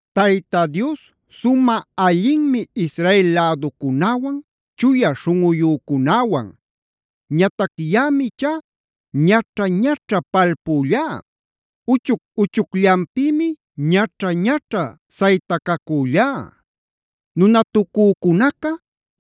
Tayta Dios sumä allinmi Israel läducunäwan, chuya śhunꞌuyücunäwan. Ñatac yaꞌam ichá ñaćha-ñaćha palpüllá. Uchuc-uchucllanpïmi ñaćha-ñaćha saytacacüllá. Nunatucücunaca,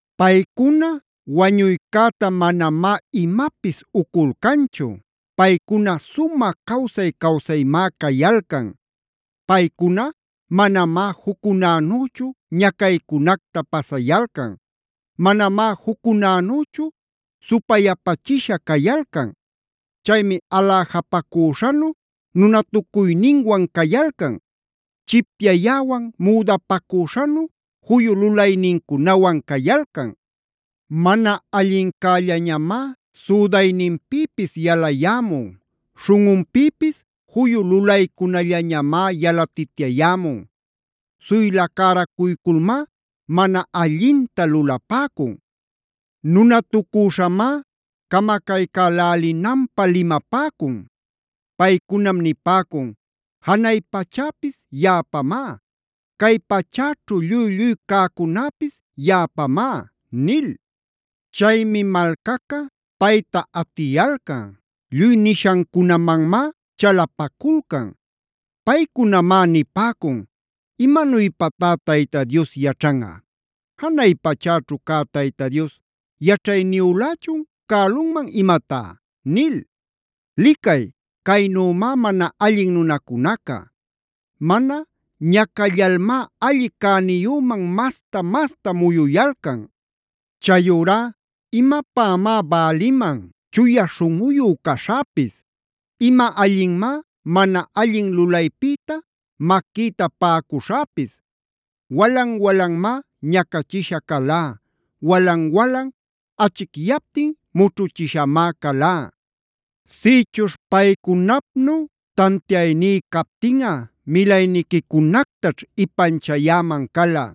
Paycuna wañuycäta manamá imapis uculcanchu. Paycuna sumä cawsay-cawsaymá cayalcan. Paycuna manamá juccunänüchu ñacaycunacta pasayalcan. Manamá juccunanüchu supayapachisha cayalcan. Chaymi aläjapacüśhanu nunatucuyninwan cayalcan. Chipyayäwanb müdapacüśhanu juyu lulaynincunawan cayalcan. Mana allincällañamá südayninpïpis yalayämun. Śhunꞌunpïpis juyu lulaycunällañamá yalatityayämun. Suyla cäracuyculmá mana allinta lulapäcun. Nunatucüśhamá camacaycälälinanpä limapäcun. Paycunam nipäcun: “Janay pachäpis yaꞌapamá. Cay pachäćhu lluy-lluy cäcunäpis yaꞌapamá” nil. Chaymi malcaca payta atiyalcan. Lluy nishancunamanmá chalapaculcan. Paycunamá nipäcun: “¿Imanuypatá Tayta Dios yaćhanꞌa? ¿Janay pachäćhu cä Dios yaćhayniyülächun cälunman imatá?” Licay, caynümá mana allin nunacunaca. Mana ñacallalmá alli cäniyüman mas-masta muyuyalcan. Chayurá ¡imapämá bäliman chuya śhunꞌuyu caśhäpis! ¡Ima allinmá mana allin lulaypïta maquïta paꞌacuśhäpis! Walan-walanmá ñacachisha calá. Walan-walan achicyaptin mućhuchishamá calá. Sïchuśh paycunapnu tantiayní captinꞌa milayniquicunactaćh ipanchayäman cala.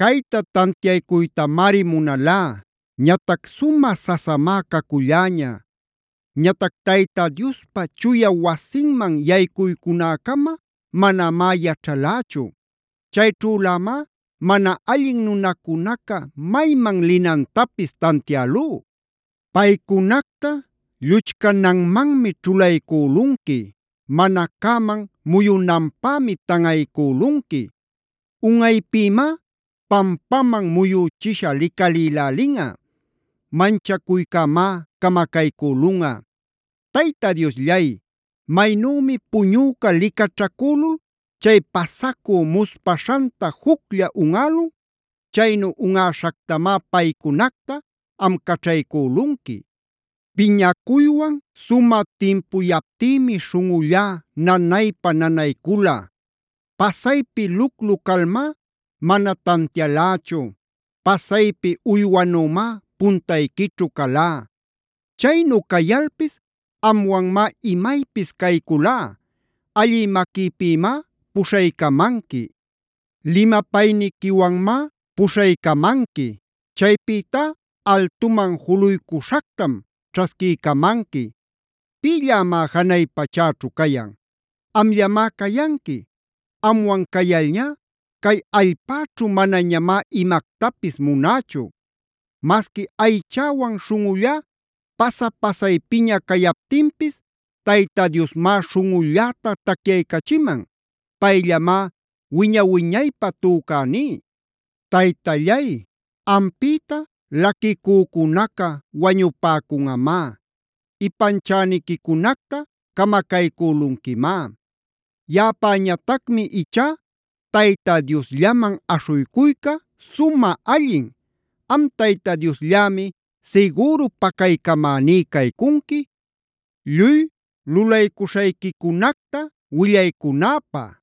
Cayta tantiaycuytamari munalá. Ñatac sumä sasamá caculläña. Ñatac Tayta Diospa chuya wasinman yaycunäcama manamá yaćhalächu; chayćhülämá mana allin nunacunaca mayman linantapis tantiälú. Paycunacta lluchcananmanmi ćhulaycülunqui. Mana cäman muyunanpämi tanꞌaycülunqui. Unꞌaypïmá pampaman muyüchisha licalïlälinꞌa. Manchacuycämá camacaycülunꞌa. Tayta Diosllay, maynümi puñüca licaćhacülul chay pasacü muspaśhanta juclla unꞌälun; chaynu unꞌäśhactamá paycunacta am caćhaycülunqui. Piñacuywan sumä timpuyaptïmi śhunꞌullá nanaypa-nanaycula. Pasaypi luclu calmá mana tantialächu. Pasaypi uywanümá puntayquićhu calá. Chaynu cayalpis amwanmá imaypis cayculá. Allï maquïpïmá puśhaycamanqui. Limapayniquiwanmá puśhaycamanqui. Chaypïtá altuman juluycuśhactam ćhasquiycamanqui. ¿Pïllämá janay pachäćhu cayan? ¡Amllamá cayanqui! Amwan cayalñá cay allpäćhu manañamá imactapis munächu. Masqui aychäwan śhunꞌullá pasa-pasaypiña cayaptinpis, Tayta Diosmá śhunꞌulläta tacyaycachiman; payllamá wiña-wiñaypä tücäní. Taytallay, ampïta laquicücunaca wañupäcunꞌamá. Ipanchäniquicunacta camacaycülunquimá. Yaꞌapäñatacmi ichá Tayta Diosllaman aśhuycuyca sumä allin. Am Tayta Diosllämi sigüru pacaycamäní caycunqui, lluy lulaycuśhayquicunacta willaycunäpä.